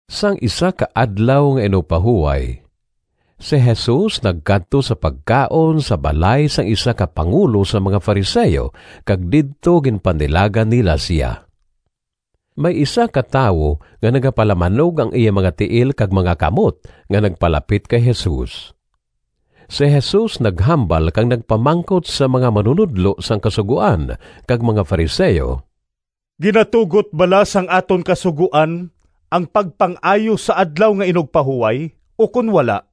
Sang isa ka Adlaw nga Inugpahuway si Jesus nagkadto sa pagkaon sa balay sang isa ka pangulo sang mga Fariseo, kag didto ginpanilagan nila sia. May isa ka tawo nga nagapalamanog ang iya mga tiil kag mga kamot nga nagpalapit kay Jesus. Si Jesus naghambal kag nagpamangkot sa mga manunodlo sang Kasugoan kag mga Fariseo, “Ginatugot bala sang aton Kasugoan ang pagpang-ayo sa Adlaw nga Inugpahuway, ukon wala?”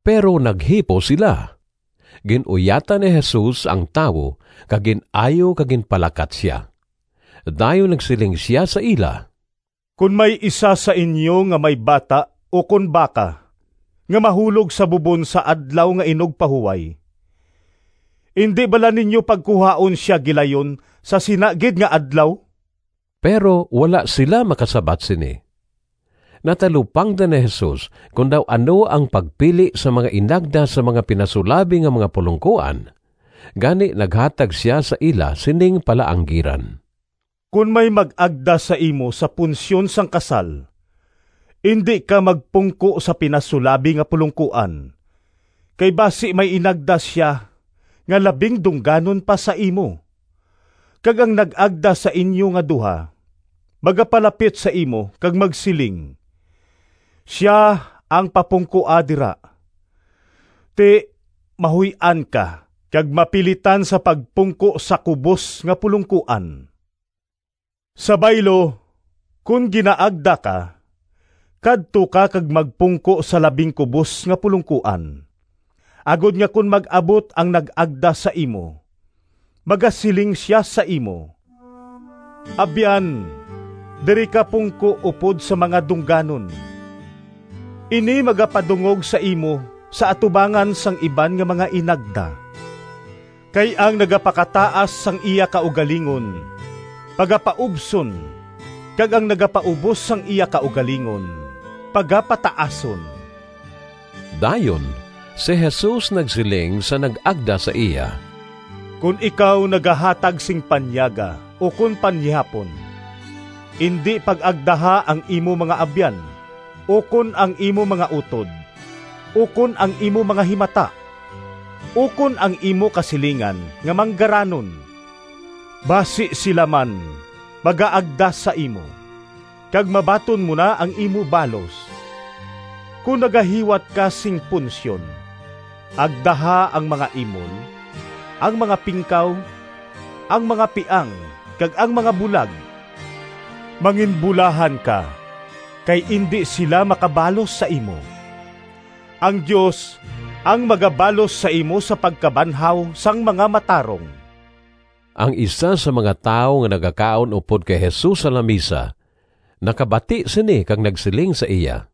Pero naghipos sila. Gin-uyatan ni Jesus ang tawo kag gin-ayo kag ginpalakat sia. Dayon nagsiling sia sa ila, “Kon may isa sa inyo nga may bata ukon baka nga mahulog sa bubon sa Adlaw nga Inugpahuway indi bala ninyo pagkuhaon sia gilayon sa sina gid nga adlaw?” Pero wala sila makasabat sini. Natalupangdan ni Jesus kon daw ano ang pagpili sang mga inagda sang mga pinasulabi nga mga pulongkoan, gani naghatag sia sa ila sining palaanggiran, “Kon may mag-agda sa imo sa punsyon sang kasal, indi ka magpungko sa pinasulabi nga pulongkoan, kay basi may inagda sia nga labing dungganon pa sa imo, kag ang nag-agda sa inyo nga duha magapalapit sa imo kag magsiling, ‘Sia ang papungkoa dira.’ Ti, mahuy-an ka kag mapilitan sa pagpungko sa kubos nga pulongkoan. Sa baylo, kon ginaagda ka, kadto ka kag magpungko sa labing kubos nga pulongkoan, agod nga kon mag-abot ang nag-agda sa imo magasiling sia sa imo, ‘Abyan, diri ka pungko upod sa mga dungganon.’ Ini magapadungog sa imo sa atubangan sang iban nga mga inagda. Kay ang nagapakataas sang iya kaugalingon pagapaubson kag ang nagapaubos sang iya kaugalingon pagapataason.” Dayon si Jesus nagsiling sa nag-agda sa iya, “Kon ikaw nagahatag sing panyaga ukon panihapon, indi pag-agdaha ang imo mga abyan, ukon ang imo mga utod, ukon ang imo mga himata, ukon ang imo kasilingan nga manggaranon, basi sila man magaagda sa imo, kag mabaton mo na ang imo balos. Kon nagahiwat ka sing punsyon, agdaha ang mga imol, ang mga pingkaw, ang mga piang kag ang mga bulag. Manginbulahan ka kay indi sila makabalos sa imo. Ang Dios ang magabalos sa imo sa pagkabanhaw sang mga matarong.” Ang isa sang mga tawo nga nagakaon upod kay Jesus sa lamisa nakabati sini kag nagsiling sa iya,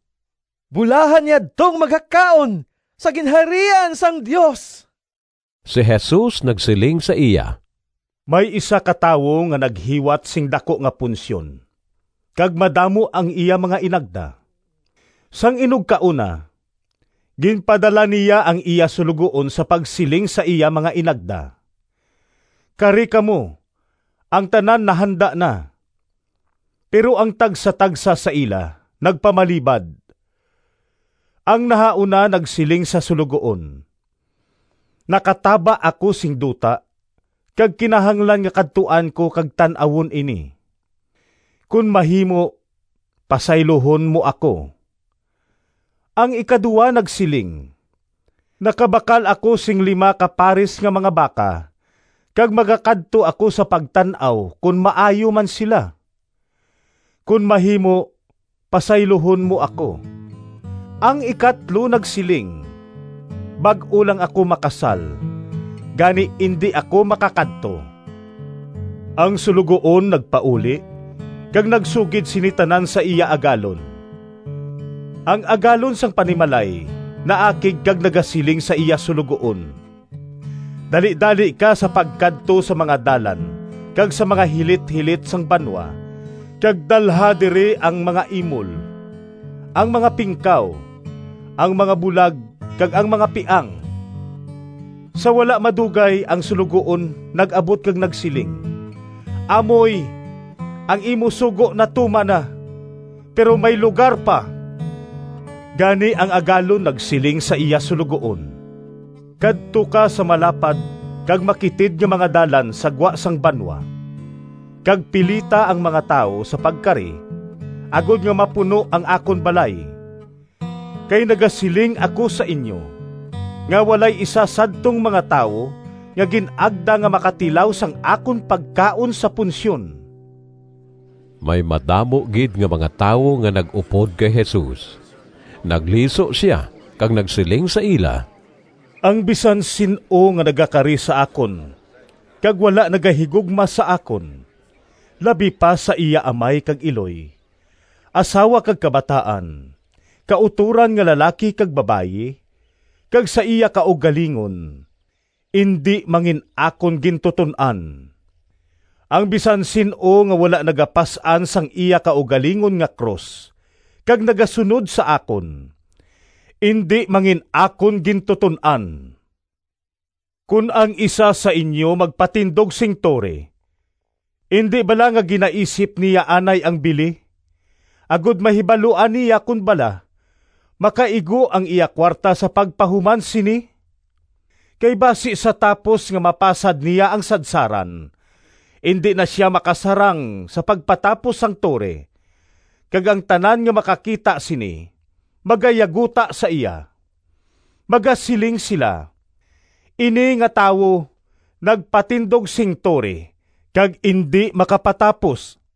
“Bulahan yadtong magakaon sa Ginharian sang Dios.” Si Jesus nagsiling sa iya, “May isa ka tawo nga naghiwat sing daku nga punsyon kag madamo ang iya mga inagda. Sang inugkaon na, ginpadala niya ang iya suloguon sa pagsiling sa iya mga inagda, ‘Kari kamo, ang tanan nahanda na.’ Pero ang tagsatagsa sa ila nagpamalibad. Ang nahauna nagsiling sa suloguon, ‘Nakataba ako sing duta kag kinahanglan nga kadtuan ko kag tan-awon ini. Kon mahimo, pasayluhon mo ako.’ Ang ikaduha nagsiling, ‘Nakabakal ako sing lima ka paris nga mga baka kag magakadto ako sa pagtan-aw kon maayo man sila. Kon mahimo pasayluhon mo ako.’ Ang ikatlo nagsiling, ‘Bag-o lang ako makasal, gani indi ako makakadto.’ Ang suloguon nagpauli kag nagsugid sini tanan sa iya agalon. Ang agalon sang panimalay naakig kag nagasiling sa iya suloguon, ‘Dalidali ka sa pagkadto sa mga dalan kag sa mga hilithilit sang banwa kag dalha diri ang mga imol, ang mga pingkaw, ang mga bulag kag ang mga piang.’ Sa wala madugay ang suloguon nag-abot kag nagsiling, ‘Amoy, ang imo sugo natuman na, pero may lugar pa.’ Gani ang agalon nagsiling sa iya suloguon, ‘Kadto ka sa malapad kag makitid nga mga dalan sa gwa sang banwa kag pilita ang mga tawo sa pagkari agod nga mapuno ang akon balay. Kay nagasiling ako sa inyo, nga walay isa sadtong mga tawo nga gin-agda nga makatilaw sang akon pagkaon sa punsyon.’” May madamo gid nga mga tawo nga nag-upod kay Jesus. Nagliso sia kag nagsiling sa ila, “Ang bisan sin-o nga nagakari sa akon kag wala nagahigugma sa akon labi pa sa iya amay kag iloy, asawa kag kabataan, kautoran nga lalaki kag babayi, kag sa iya kaugalingon indi mangin-akon gintuton-an. Ang bisan sin-o nga wala nagapas-an sang iya kaugalingon nga krus kag nagasunod sa akon, indi mangin-akon gintuton-an. Kon ang isa sa inyo magpatindog sing tore, indi bala nga ginaisip niya anay ang bili, agod mahibaluan niya kon bala makaigo ang iya kuwarta sa pagpahuman sini? Kay basi sa tapos nga mapasad niya ang sadsaran, indi na sia makasarang sa pagpatapos sang tore, kag ang tanan nga makakita sini magayaguta sa iya. Magasiling sila, ‘Ini nga tawo nagpatindog sing tore kag indi makapatapos.’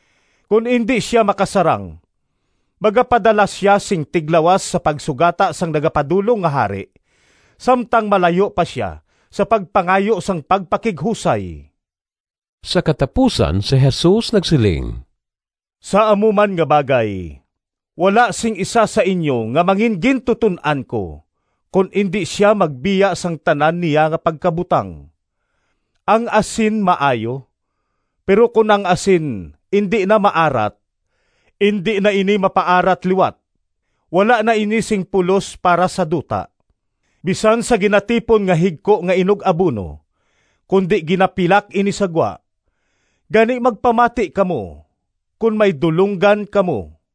Kon indi sia makasarang, magapadala sia sing tiglawas sa pagsugata sang nagapadulong nga hari samtang malayo pa sia sa pagpangayo sang pagpakighusay.” Sa katapusan si Jesus nagsiling, “Sa amo man nga bagay, wala sing isa sa inyo nga mangingintuton-an ko kon indi sia magbiya sang tanan niya nga pagkabutang.” “Ang asin maayo, pero kon ang asin indi na maarat, indi na ini mapaarat liwat. Wala na ini sing pulos para sa duta, bisan sa ginatipon nga higko nga inug-abuno, kundi ginapilak ini sa gwa. Gani, magpamati kamo kon may dulonggan kamo!”